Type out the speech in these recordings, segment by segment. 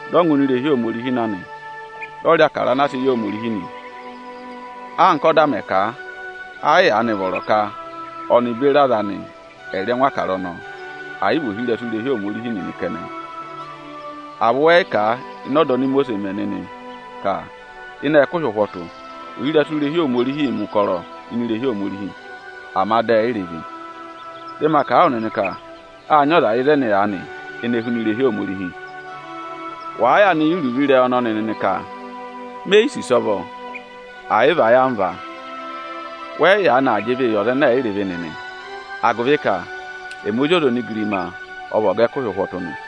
dị ọ ngụ ini irehi ahẹkẹ Aniju na nị, dị ọ rị Ịbụrẹẹdị anaa sị yị Ohomorihi nị. Anka ọ́da mẹ̀ kà a, ẹ yị yaanị vọrọ ka ọnị aza anị ẹ̀ rị ẹngụ Ịbụrẹẹdị ọnọọ, ẹ̀ yị vị ohirẹsụ irehi Ohomorihi nịnị kẹnẹ. À vị wẹ yị kà a ịnị ọda oni Imosiisi mẹ nịnị ka ịnị ẹkụhị ụhwọtụ ohirẹsụ irehi Ohomorihiī mẹ̀ ụkọrọ ini irehi Ohomorihi, ama dị ẹ yị rị ịvị? Dị maa kà a wụ nịnị ka â nyị ọza ịzẹnị aanị ene huna irehi Ohomorihi. Wàa yaanị yẹ iruvo ịrẹyị ọnọnị nịnị ka: ‘Me yi sì ịsọvọ ẹ̀ yị vị ayamva’, wẹ yị yaanị aa jị ịvịị yị ọza ẹnẹ ẹ̀ yị rị ịvị nịnị, agụvị ka ẹmị Ozi ọza onigirima ọ vị ọga ẹkụhị ụhwọtụ nị.”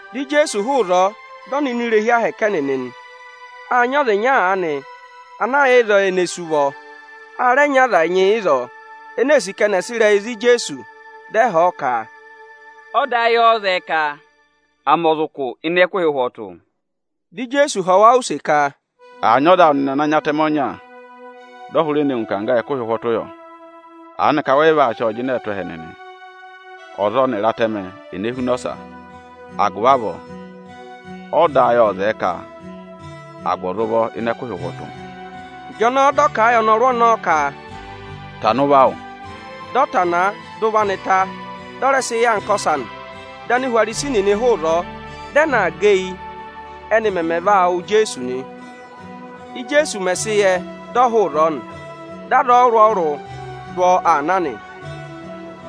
Dị Ijeesu hụụ ịzọọ, dị ọ nọ ini irehi Ohomorihi ẹnịnị nị. Â nyị ọza ịnya aanị ana yà ịzọọ ene sú ụvọ. A rẹ nyị aza ẹnyị ịzọọ ene ee sì ka ẹnị ẹ̀ sị ịrẹyị za Ijeesu, dị ẹ họ̀ ọ ka, “Ọda ayị ọ́ọ́ zẹẹ ka à mẹ ọza ụkụ ịnị ẹkụhị ụhwọtụ?” Dị Ijeesu họ̀ wa use ka, “Àa nyị ọza awụ nịnị ana nyị atẹmẹ ọnya, dị ọ hụrẹ ne ngụ ịkangga ịnị ẹkụhị ụhwọtụ yọ? Aanịka wẹ yị vaa sị ọọ jịnẹẹ tụ́ ẹhẹ nịnị? Ọza ọnịrị atẹmẹ, ene huna ọsa? Agụvị avọọ, ọda ayị ộ zẹẹ ka à gụ ọza ụvọ ịnị ẹkụhị ụhwọtụ.” Ịjọnọọ dị ọ kà a yị ọnọrụ ọnọọ ka, “Tana ụvọ awụ!” Dị ọ tanaa, dị ụvọ anị ta, dị ọ rẹ sị yà anka ọsa nị. Dị Anihwarisi nịnị hụụ ịzọọ, dị ẹ na aa gẹ eyi, ẹ́nị mẹmẹ vaa wụ̀ Ijeesu nị. Íjeesu mẹ̀ sị yẹ, dị ọ hụụ ịzọọ nị. Dị aza ọrụrụ-ọrụrụ dụ ọ aa na nị.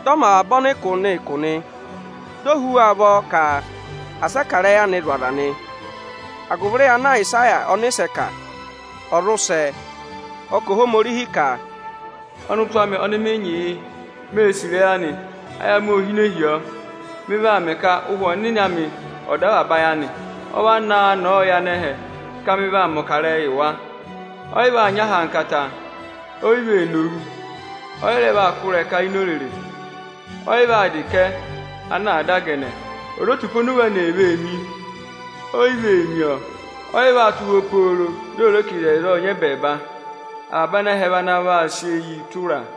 Dị ọ mẹ avaba ọnịkụ nịnị ụkụ nị. Di o hú wa ụvọ ka asị ẹ kà ịrẹyị anị zụ̀ aza nị, agụvị ịrẹyị ana Ayịsaya ọnịsẹ kà, ọ̀ zụ sẹ. Ọ kà Ohomorihi ka: “Ọnịtụ amị ọnị mị nyị yị. Mée sì ịrẹyị anị, ayị amị ô hine tù ọ. Mị vaa mẹ ka Ụhwẹ Ọnịnị amị ọ̀ dọ avaba ayị anị. Ọ vaa naa nọọ yị anẹhẹ ka mị vaa mẹ̀ ọkarẹyị yị wa. Ọ yị vaa nyị ahankata, o yi vee nowu, ọ yị rẹ vaa kụ́ ịrẹka ini orere. Ọ yị vaa dà ịkẹ ana àa dà gẹnẹ. Ozotupa oni owu anị ee mi, oyi vee mi ọọ. Ọyị vaa tụ́ ụhwọ́ pooro di ò re ka ịzẹyịza ộ nyị ẹbẹẹba. Avaba anẹhẹ vị ana vaa sị eyii tụra a.”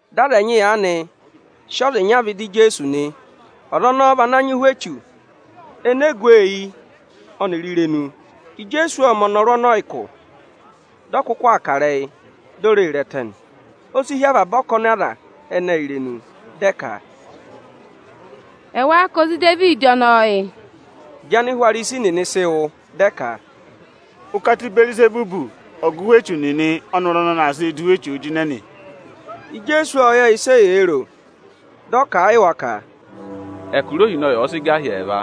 Dị aza ẹnyị aanị sị ọza ịnya aanị vẹ ịdị Ijeesu nị. Ọza ọnọọ vị ana nyị ụhwẹ echu ene gu ọ eyi ọnịrị irenu. Ijeesu ộ mẹ̀ ọnọrụ ọnọọ ụkụ, dị ọ kụkụ aa kà ịrẹyị, di o ree re ẹtẹ nị. O si hí avaba ọkọnị aza ẹnẹẹ irenu, dị ẹ ka, “Ẹwáá ka ozi Idevidi ọnọọ yị?” Ịjị Anihwarisi nịnị sị wụ́, dị ẹ ka, “Ụkata Ịbẹẹrịzẹbụ, ọga ụhwẹ echu nịnị ọ́nọrụ ọnọnị aa sịị dụ ụhwẹ echuu jịnẹ nị.” Ijeesu ộ yẹ ịsị eyee ro, dị ọ kà a yị wa ka, “Ẹkụra ohinọyị ọ̀ọ sị gà hi ẹẹva,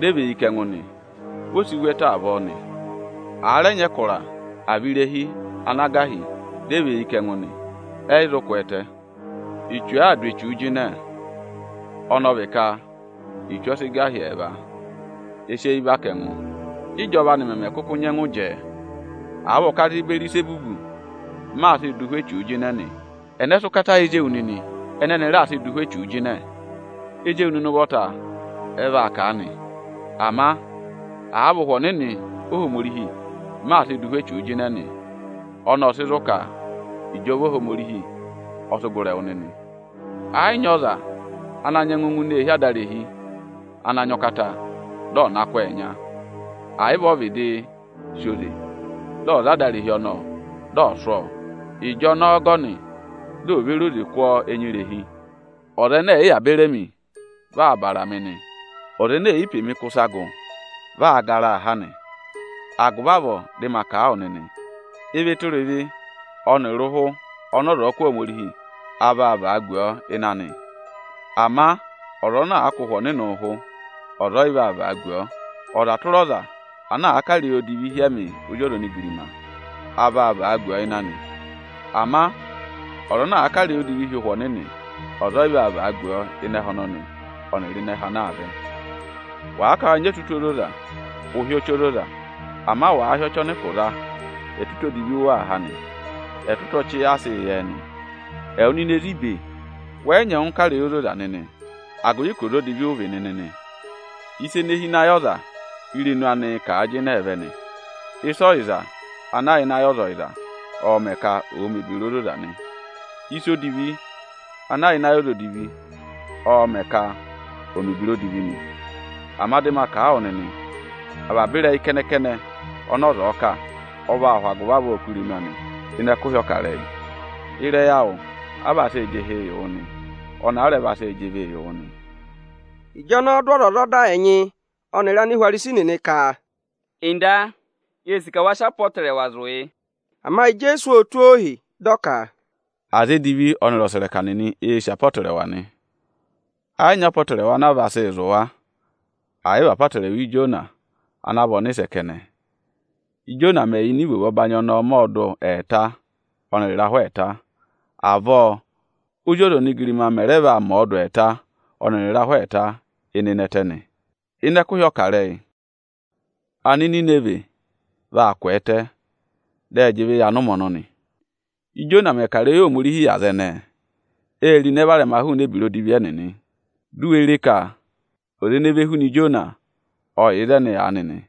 dị ẹ và eyi kà ẹngụ nị, vi o si vu ẹtẹ avọọ nị. Àa rẹ nyị ẹkụra, àa vị irehi ana gà hi, dị ẹ và eyi kà ẹngụ nị, ẹ yị zụ kwẹẹtẹ. Echu àaa dụ echuu jịnẹ, ọnọọ vị ka echu ọ sị gà hi ẹẹva, e sị eyi và kà ẹngụ; ị́jọva anị mẹmẹ kụkụ nyẹngụ jẹẹ? Àa vị ụkata Ịbẹẹrịzẹbụ, m maa sịị dụ ụhwẹ echuu jịnẹ nị, ẹnẹ sị ụkata yị ezi ewu nịnị ẹnẹ ẹnị raa sịị dụ ụhwẹ echuu jịnẹ? Ezi ewu nịnị ụvọta ẹ vaa kà a nị. Ama àa vị Ụhwẹ Ọnịnị Ohomorihi, m maa sịị dụ ụhwẹ echuu jịnẹ nị, ọnọọ ộ sị zụ̀ ka ịjọva Ohomorihi ọ sị gụrị ẹwụ nịnị. Ẹ yị nyị ọza ana nyẹngụ ngụ ini eehi adarehi ana nyị ụkata dị ọ̀ na kụ́ ọọ ẹnya; ẹ̀ yị vị o vịdị sì oze dị ọ̀ za adarehi ọnọọ dị ọ̀ sụ́ ọ, ịjọnọọ ọgọnị di o ve re oze kụ́ ọ ẹnya irehi. Ọza ẹnẹ ẹ̀ yị yà beri emi, vị aa bàrà mị nị. Ọza ene è yi pe mi kụ́ ịsa gụ, vị aa garaa ha nị. Agụvị avọọ dị ma kà a wụ nịnị, ịvị tụra ịvị ọnịrị ụhụ ọnị ọza ọ̀ọ kụ̀ Ohomorihi, a vaa vagu ọọ ịnị anị. Ama ọza ana àa kụ̀ Ụhwẹ Ọnịnị ụhụ, ọza ọyị vaa vagu ọọ. Ọza tụra ọza ana àa kà ịrẹyị odivi hi ẹmị Ozi ọza onigirima, a vaa vagu ọọ ịnị anị. Ama ọza ana àa kà ịrẹyị odivi hi Ụhwẹ Ọnịnị, ọza ọyị vaa vagu ọọ ịnị ẹhẹ ọnọnị ọnịrị ịnị ẹhẹ ana aa vẹ.” “Wàa ka wa nyị ẹtụtụ ozoza, ụ hị́ ọchị ozoza! Ama wàa hị́ ọchị ọnị ụkụ za, ẹtụtụ odivi ụ waa há nị. Ẹtụtụ ọchị a sịị yẹ ẹ nị. Ẹwụ nịnị ezi ibe, wẹ yị nyẹngụ kà ịrẹyị ozoza nịnị, agụvị ka ọza odivi ụ vị nịnị nị. Ịsa ene hi ịnị ayị ọza, írenu anịị̄ kà a jịnẹẹ vẹ nị. Ịsa ọyịza ana yà ịnị ayị ọza ọyịza, ọọ̄ mẹ̀ ka ọọ mẹ̀ ebira ozoza nị. Ịsa odivi ana yà ịnị ayị ọza odivi, ọọ̄ mẹ̀ ka ọọ mẹ̀ ebira odivi nị. Ama dị ma kà a wụ nịnị, avaba ịrẹyị kẹnẹ-kẹnẹ ọnị ọza ọ̀ọ kà, ọ vaa hụ agụvị avọọ kụ́ irenu anị ịnị ẹkụhị ọkarẹyị. Ịrẹyị awụ a vaa sị jị ịhị yị wụ nị, ọnị a rẹ vaa sị jị ịvị yị wụ nị.” Ịjọnọọ dị ọzwọzọda ẹnyị ọnịrị Anihwarisi nịnị ka, “Ọga, yee sì ka wa sị apọtẹrẹwa zụ̀ yị.” Ama Ijeesu ô tụ́ ohi, dị ọ ka, “Aza edivi ọnịrị ọsẹrẹka nịnị eē sì apọtẹrẹwa nị. Ẹ yị nyị apọtẹrẹwa ana vaa sị zụ̀ wa, ẹ̀ yị vị apọtẹrẹwa Ijona ana vị ọnịsẹ. Íjona mẹ̀ yà ịnịnẹ ivovo ọbanyị ọnọọ mẹ ọọdụ ẹẹta ọnịrị ịrahụ ẹẹta, avọọ Ózi ọza onigirima mẹ̀ rẹ vaa mẹ ọọ dụ ẹẹta ọnịrị ịrahụ ẹẹta ịnịnẹ ẹtẹ nị. Ịnị ẹkụhị ọkarẹyị, Anininivẹ vaa kwẹẹtẹ, dị ẹ jị ịvị yị anụmẹ ọnọnị; Íjona mẹ̀ kà ịrẹyị Ohomorihi yị aza ẹnẹẹ, ée ro ịnẹ varẹma hụụnị ebira odivi ẹnịnị. Di u we re ka ọza ene ve huna Ijona, ọ yà ịzẹnị aanị nị.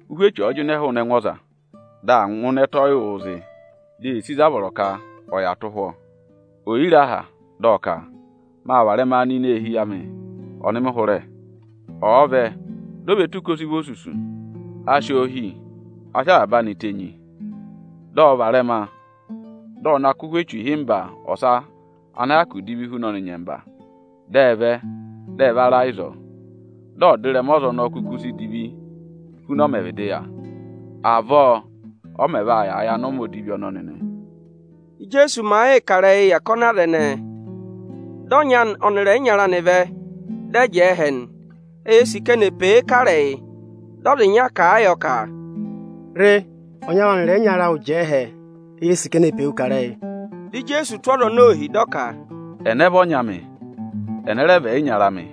“Ụhwẹ echu ọ̀ọ jịnẹ hụụnị ẹngụ ọza, dị aa ngụ ịnị ẹtẹ ọyịwụụ zị, di ee sì ịzị a vọrọ ka ọ̀ yà tụ́ ụhwọ́, Ò yi re aha, dị ọ ka: ‘Maa varẹma nọ ini eehi amị ọnị mị hụrẹ.’ Ọ̀ọ vẹ, di o ve tù ka ọ sị vị osusu, a si oo hì, a sị avaba anị tenyi nị, dị ọ varẹma, dị ọ na kụ́ ụhwẹ echu ịhịmba ọsa ana hyakụ divi hu ọnị nyẹmba, dị ẹ vẹ, dị ẹ va ra ịzọọ. Dị ọdịrẹma ọza ọnọọ kuku si divi huna ọ mẹẹ̄ vịdịị yà. Avọọ ọ mẹ̀ vaa yàa yị anụmẹ odivi ọnọnị nị.” Íjeesu màa yịị kà ịrẹyịị yị ọkọnị aza ẹnẹẹ, dị ọnyị anị ọnịrị ẹyịnyara anị vẹ, dị ẹ jẹẹ ẹhẹ nị. Eyee sì ka eni è pe e kà ịrẹyị. Dị ọza ịnya kà a yọ ka, “Re, ọnyị awụ ọnịrị ẹyịnyara awụ jẹẹ ẹhẹ, eyee sì ka eni è pe wu kà ịrẹyị.” Dị Ijeesu tụ́ ọza ọnọọ ohi, dị ọ ka, “Ẹnẹ vị ọnyị amị, ẹnẹ rẹ vị ẹyịnyara amị?”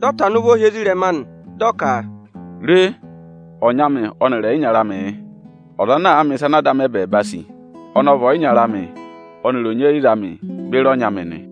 Dị ọ tana ụvọ hi ezirẹma anị dị ọ ka, “Re, ọnyị amị ọnịrị ẹyịnyara amị yị. Ọza ana àa mẹ̀ ịsa ana Ada amị ẹbẹẹba sì, ọnị ọ vị ọyịnyara amị ọnịrị onyeyiza amị beri ọnyị amị nị.”